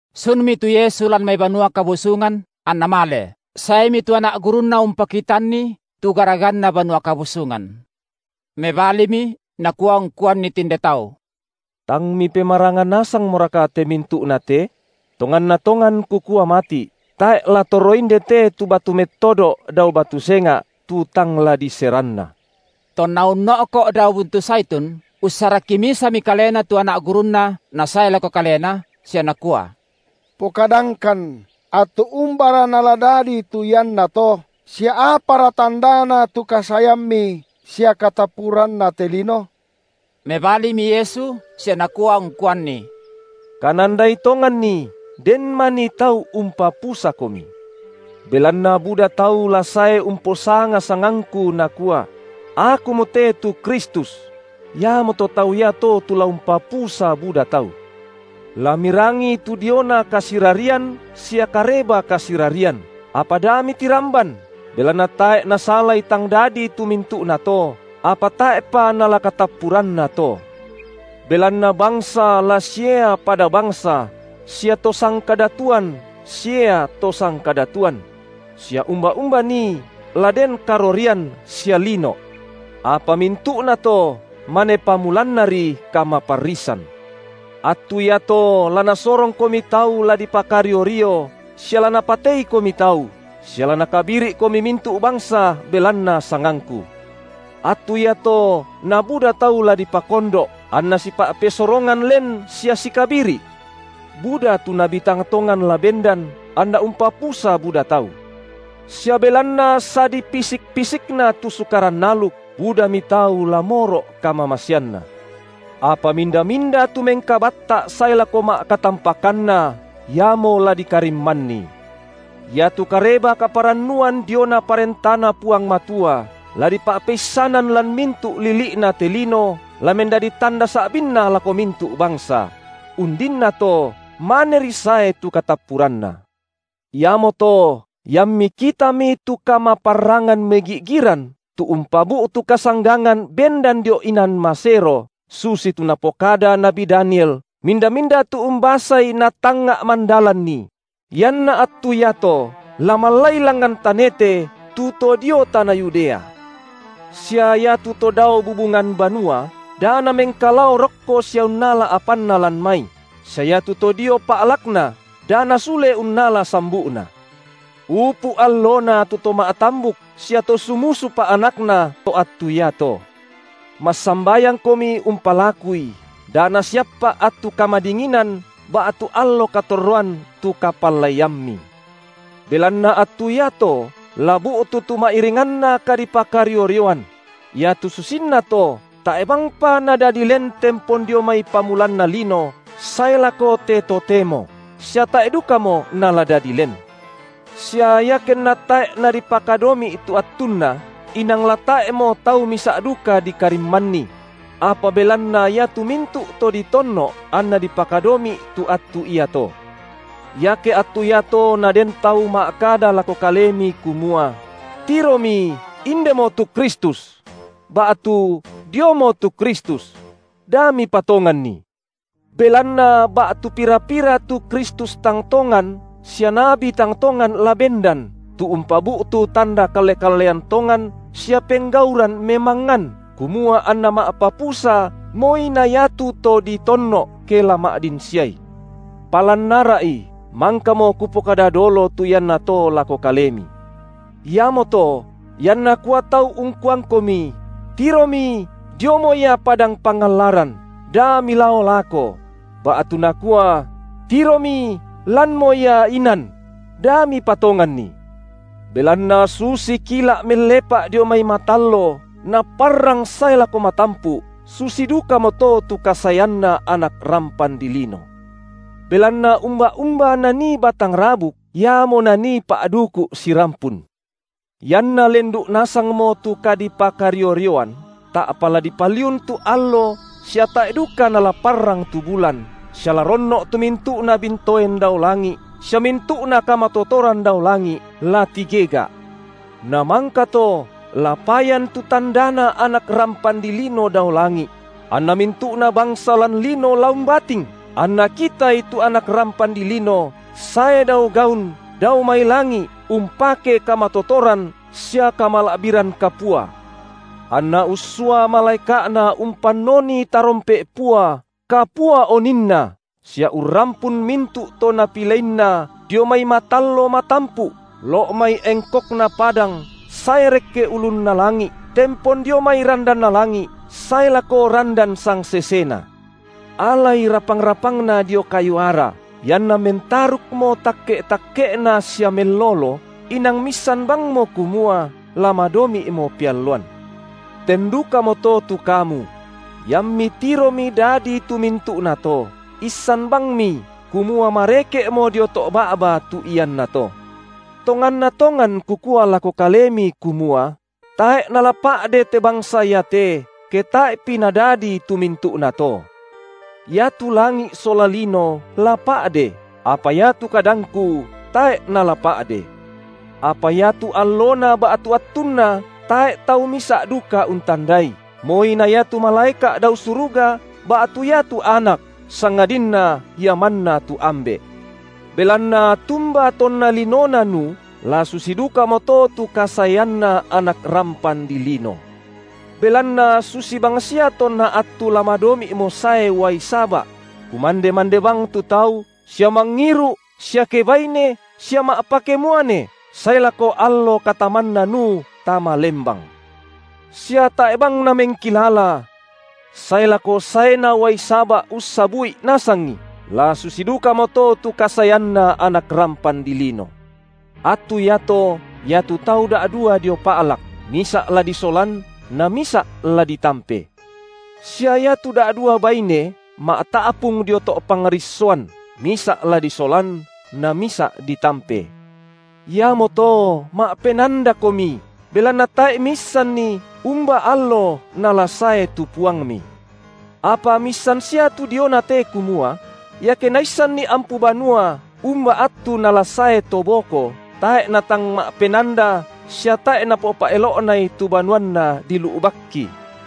Sunmi tu Yesu lan mai Banua Kabusungan anNa male; saemi tu anak gurunNa umpakitanNi tu garaganna Banua Kabusungan. Mebalimi Nakua ungkuanni tinde tau: Tang mipemaranga nasangmoraka te mintu’na te? Tonganna tongan Kukua mati’, tae’ la torro indete tu batu mettodo’ dao batu senga’, tu tang la diseranna. Tonna unno’ko’ dao buntu Zaitun, ussarakki misami kalena tu anak gurunNa nasae lako Kalena, sia nakua: Pokadangkan, attu umbara nala dadi tu iannato, sia apara tandana tu kasaeamMi sia katappuranna te lino? Mebalimi Yesu sia Nakua ungkuanni: Kanandai tonganni, den manii tau umpapusakomi. Belanna buda tau la sae umposanga sangangKu, nakua: Akumote tu Kristus! iamoto tau iato tu la umpapusa buda tau. La mirangi tu diona kasirarian sia kareba kasirarian, apa da mitiramban, belanna tae’ nasalai tang dadi tu mintu’nato, apa tae’pa nala katappuranna to. Belanna bangsa la siea pada bangsa sia to sangkadatuan siea to sangkadatuan; sia umba-umba nii la den karorian sia lino’. Apa mintu’nato, mane pamulannari kamaparrisan. Attu iato la nasorongkomi tau la dipakario-rio sia la napateikomi tau, sia la nakabiri’komi mintu’ bangsa belanna sangangKu. Attu iato nabuda tau la dipakondo’, anna sipa’pesorongan len sia sikabiri’. Buda tu nabi tang tongan la bendan, anna umpapusa buda tau. Sia belanna sadipisik-pisikna tu sukaran aluk, budami tau la moro’ kamamaseanna. Apa minda-minda tu mengkabatta’ sae lako ma’katampakanna, iamo la dikarimmanni. Iatu Kareba kaparannuan diona ParentaNa Puang Matua la dipa’peissanan lan mintu’ lili’na te lino la mendadi tanda sa’binna lako mintu’ bangsa; undinnato, maneri sae tu katappuranna. Iamoto, iammi kitami tu kamaparrangan megi’giran tu umpabu’tu kasanggangan bendan dio inan masero, susitu napokada nabi Daniel minda-minda tu umbasai natangnga’ mandalanni – ianna attu iato la mallai langngan tanete tu to dio tana Yudea: sia iatu to dao bubungan banua, da namengkalao rokko sia unnala apanna lan mai, sia iatu to dio pa’lakna, da nasule unnala sambu’na. Upu’ allona tu to ma’tambuk sia to sumusupa anakna to attu iato. Massambayangkomi umpalakui da nasiappa’ attu kamadinginan ba’tu allo katorroan tu kapallaiammi. Belanna attu iato la bu’tu tu ma’iringanna kadipakario-rioan; iatu susinna to tae’ bangpa nadadi len tempon dio mai pamulanna lino sae lako te totemo, sia tae’ dukamo nala dadi len. Sia iakenna tae’ nadipakadomi’ tu attunna, inang la tae’mo tau misa’ duka dikarimmanni; apa belanna iatu mintu’ to ditonno’, anna dipakadomi’ tu attu iato. Iake attu iato naden tau ma’kada lako kalemi kumua: Tiromi, indemo tu Kristus!, ba’tu: Diomo tu Kristus!, da mipatonganni. Belanna ba’tu pira-pira tu Kristus tang tongan sia nabi tang tongan la bendan, tu umpabu’tu tanda kalle-kallean tongan sia penggauran memangngan, kumua anna ma’papusa moi na iatu to ditonno’, ke la ma’din siai. Palan ara’i, mangkamo kupokada dolo tu iannato lako kalemi. Iamoto, ianna kua tau ungkuangkomi: Tiromi, diomo Ia padang pangallaran, da milao lako; ba’tu nakua: tiromi, lanmo Ia inan; da mipatonganni. Belanna susi kila’ mellepa’ dio mai matallo, naparrang sae lako matampu’ susi dukamoto tu kasaeanna Anak rampan dilino. Belanna umba-umba nanii batang rabuk, iamo nanii pa’duku’ sirampun. Ianna lendu’ nasangmo tu kadipakario-rioan, ta’pa la dipaliun tu allo sia tae’ duka nala parrang tu bulan, sia la ronno’ tu mintu’na bintoen dao langi’, sia mintu’na kamatotoran dao langi’ la tigega’. Namangkato la payan tu tandaNa Anak rampan dilino dao langi’; anna mintu’na bangsa lan lino la umbating, anna kitaI tu Anak rampan dilino sae dao gaun dao mai langi’ umpake kamatotoran sia kamala’biran kapua. Anna ussua malaeka’Na umpannoni tarompe’ pua, kapua oninna, sia urrampun mintu’ to NapileinNa dio mai matallo matampu’, lo’ mai engkokna padang sae rekke ulunna langi’, tempon dio mai randanna langi’ sae lako randan sangsesena. Alai rapang-rapangna dio kayu ara: ianna mentarukmo takke’-takke’na sia mellolo, inang miissan bangmo kumua la madomi’mo pealloan. Ten dukamoto tu kamu: Iammi tiromi dadi tu mintu’nato, issan bangmi, kumua mareke’mo dio to’ ba’ba tu iannato. Tonganna tongan Kukua lako kalemi kumua: Tae’ nala pa’de te bangsa iate, ke tae’pi nadadi tu mintu’nato. Iatu langi’ sola lino la pa’de, apa iatu kadangKu tae’ nala pa’de. Apa iatu allona ba’tu attunna tae’ tau misa’ duka untandai, moi na iatu malaeka’ dao suruga ba’tu iatu Anak, sangadinna Ia manna tu Ambe’. Belanna tumba tonna linona Nuh, la susi dukamoto tu kasaeanNa Anak rampan dilino. Belanna susi bangsia tonna attu la madomi’mo sae uai saba’: kumande-mande bang tu tau, sia mangiru’ sia kebaine sia ma’pakemuane, sae lako allo katamanna Nuh tama lembang. Sia tae’ bang namengkilala, sae lako saena uai saba’ ussabu’i nasangi, la susi dukamoto tu kasaeanNa Anak rampan dilino. Attu iato iatu tau da’dua dio pa’lak, misa’ la disolan na misa’ la ditampe. Sia iatu da’dua baine ma’ta’pung dio to’ pangrissoan, misa’ la disolan na misa’ ditampe. Iamoto ma’penandakomi, belanna tae’ miisanni, umba allo nala sae tu Puangmi. Apa miissan sia tu diona te kumua: Iake naissanni ampu banua umba attu nala sae to boko, tae’ natang ma’penanda sia tae’ napopa’elo’nai tu banuanna dilu’bakki.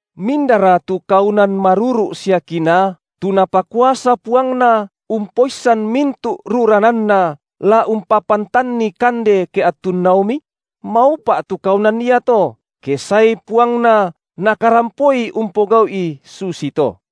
Mindara tu kaunan maruru’ sia kinaa, tu napakuasa puangna umpoissan mintu’ rurananna la umpapantanni kande ke attunnaomi? Maupa’ tu kaunan iato, ke saei puangna nakarampoi umpogau’i susi to.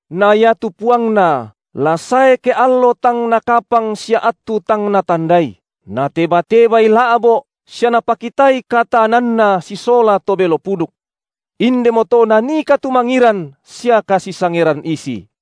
Na iatu puangna la sae ke allo tang nakapang sia attu tang natandai, nateba-tebai la’bo’ sia napakitai kataananna sisola to belo puduk. Indemoto nanii katumangiran sia kasisangeran isi.